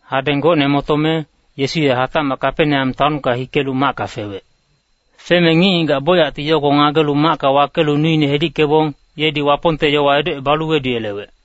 Hadeng gocne motome, Yesu ye hatacmac Kapeneam taonka hikelu macka fewec. Feme ngic-ngigac bocyacti yogo ngagelu macka wakelu nuine hedickebong, yedi Wapongte yowa edocebalu weduyelewec.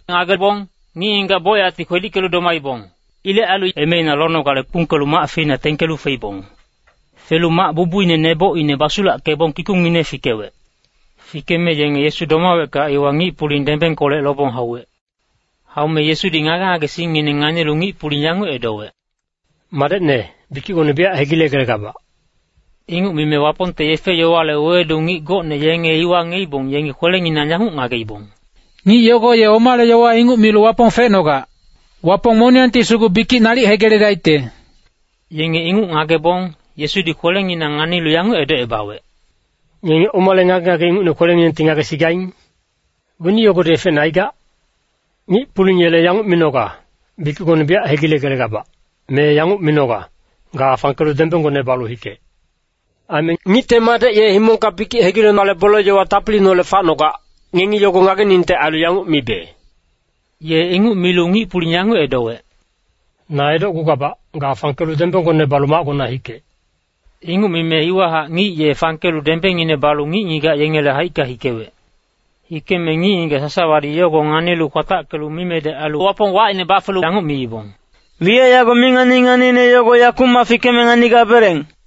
Ngagebong, ngic-ngigac bocyacti kwedickelu domaibong. Ilec ailu emeina lonogale kpungkelu mac feina tengkelu feibong. Felu mac bubuine nebocine basulackebong kikungngine fikewec. Fikeme yenge Yesu domawecka iwa ngic-puling dembengkolec lobong hauwec. Haume Yesudi ngage-ngagesingngineng nganilu ngic-puling yanguc edowec, “Madecne, bikicgone biyac hegilegelegabac.” Inguc mime Wapongte yefe-yowale wewedu ngic gocne yenge iwa ngiyeibong, yengi kwelenginang yanguc ngageibong, “Ngic yogo ye omale yowa inguc milu Wapong fecnogac! Wapong moniyangti sugu bikic nalic hegiledaicte.” Yenge inguc ngagebong, Yesudi kwelenginang nganilu yanguc edocebawec, “Ngenge omale ngage-ngage ingucne kwelenginengti ngagesigaing? Weni yogodi efecne aigac? Ngic-puling yele yanguc minoga, ‘Bikicgone biyac hegilegelegabac’, me yanguc minoga, ‘Ga fangkelu dembenggone balu hikec.’ Aime Ngicte Madec, ye himongka bikic hegilenale bole-yowa tapiliineholec facnogac, ngengi yogo ngageningte ailu yanguc mibe.” Ye inguc milu ngic-puling yanguc edowec, “Na edocgugabac, ga fangkelu dembenggone balu macgona hikec.” Inguc mime iwahac ngic ye fangkelu dembengngine balu ngic-ngigac yengele haicka hikewec. Hikeme ngic-ngigac sasawadi yogo nganilu kwatackelu mimedec ailu Wapong wacine bafelu yanguc miibong, “Wiyac yago mi ngani-nganiine yogo yakumac fikeme nganigabeleng.”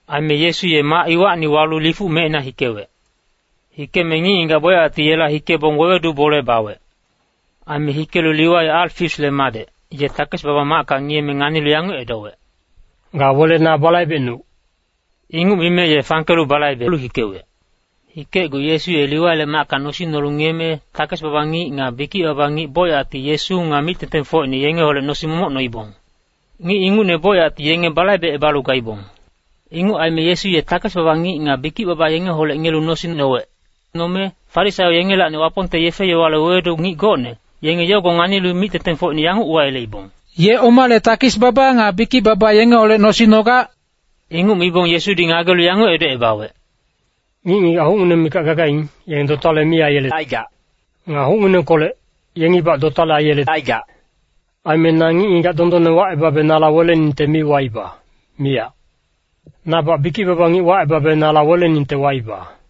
Aime Yesu ye mac iwacni walu lifuc mecina hikewec. Hikeme ngic-ngigac bocyacti yela hikebong wewedu bole bawec. Aime hikelu Liwai Alfaiusle madec, ye takes-baba macka ngiyeme nganilu yanguc edowec, “Ga wele na balaibecnuc!” Inguc mime ye fangkelu balaibelu hikewec. Hikecgu Yesu ye Liwaile macka nosing nolu ngiyeme, takes-baba ngic nga bikic-baba ngic bocyacti Yesu nga mic-tengtengfocine yengeholec nosing momoc noibong. Ngic ingucne bocyacti yenge balaibecebalu gaibong. Inguc aime Yesu ye takes-baba nga bikic-baba yengeholec ngiyelu nosing nowec. Nome Farisaio yengelacni Wapongte yefe-yowale wewedu ngic gocne, yenge yogo nganilu mic-tengtengfocine yanguc uwayeleibong, “Ye omale takes-baba nga bikic-baba yengeholec nosing nogac?” Inguc mibong Yesudi ngagelu yanguc edocebawec, “Ngic-ngigac hucngineng mikac gagaing, yenge dotale mi aiyelecaigac. Nga hucnginengkolec, yengibac dotale aiyelecaigac. Aime na ngic-ngigac dondonne wacebabe nala weleningte mi waiba, miyac. Nabac bikic-baba ngic wacebabe nala weleningte waiba.”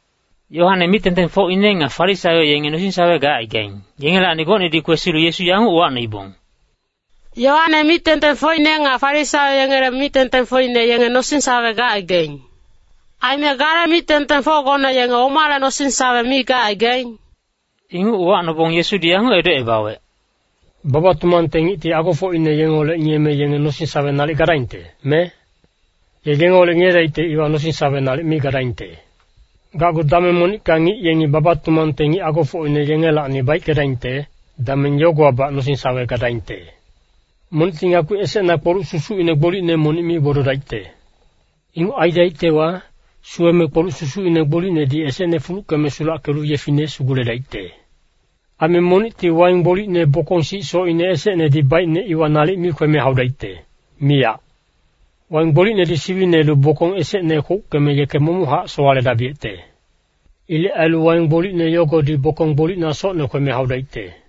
Yoane mic-tengtengfocine nga Farisaio yenge nosing-sawe gacaigaing, yengelacni gocnedi kwesilu Yesu yanguc uwacnoibong, “Yoane mic-tengtengfocine nga Farisaio yengele mic-tengtengfocine yenge nosing-sawe gacaigaing. Aime gale mic-tengtengfocgone yenge omale nosing-sawe mi gacaigaing?” Inguc uwacnobong Yesudi yanguc edocebawec, “Baba-tumangte ngicti agofocine yengeholec ngiyeme yenge nosing-sawe nalic gadaingte, me? Ye yengeholec ngiyedaicte iwa nosing-sawe nalic mi gadaingte. Gacgu dameng monicka ngic yengi baba-tumangte ngic agofocine yengelacni baickedaingte, dameng yogowabac nosing-sawe gadaingte. “Monicti ngakpi esecna kpoluc sindacine gbolicne monic mi gbododaicte. Inguc aidaictewa, suweme kpoluc susucine gbolicnedi esecne fuluckeme sulackelu yefine suguledaicte. Aime monicti waing gbolicne bokong sic socine esecnedi baicne, iwa nalic mi kweme haudaicte, miyac. Waing gbolicnedi siwinelu bokong esecne kwouckeme yeke momochac sowaledabiyecte. Ilec ailu waing gbolicne yogodi bokong gbolicna socne kweme haudaicte.”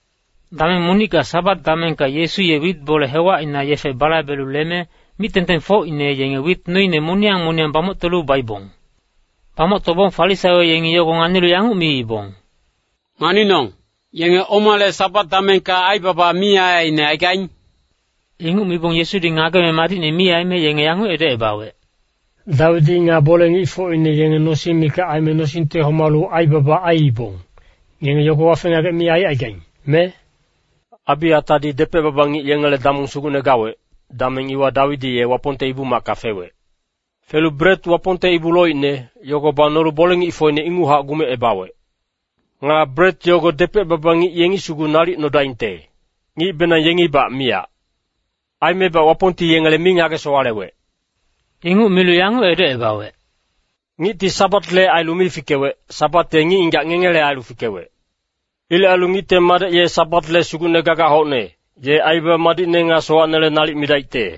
Dameng monicka Sabat damengka Yesu ye wit bole hewacina yefe balaibelu leme, mic-tengtengfocine yenge wit noine moniyang moniyang bamoctolu baibong. Bamoctobong Farisaio yengi yogo nganilu yanguc miibong, “Nganinong, yenge omale Sabat damengka aibaba mi aiaiine aigaing?” Inguc mibong Yesudi ngageme madicne mi aime yenge yanguc edocebawec, “Dawidi nga bole-ngicfocine yenge nosing mikac aime nosingte homalu aibaba aiibong, ngenge yogo wafe-ngagec mi aicaigaing, me? Abiatadi depec-baba ngic yengele damong sugucne gawec, dameng iwa Dawidi ye Wapongte Ibu-macka fewec. Felu bret Wapongte ibu loicne, yogo banolu bole-ngicfocine inguchac gumecebawec. Nga bret yogo depec-baba ngic yengi sugu nalic nodaingte, ngicbenang yengibac miyac. Aimebac Wapongti yengele mi ngage-sowalewec.” Inguc milu yanguc edocebawec, “Ngicti Sabatle ailu mi fikewec, Sabat ye ngic-ngigac ngengele ailu fikewec. Ilec ailu Ngicte Madec ye Sabatle Sugucne gagac hocne, ye aibaba madicne nga sowacnele nalic midaicte.”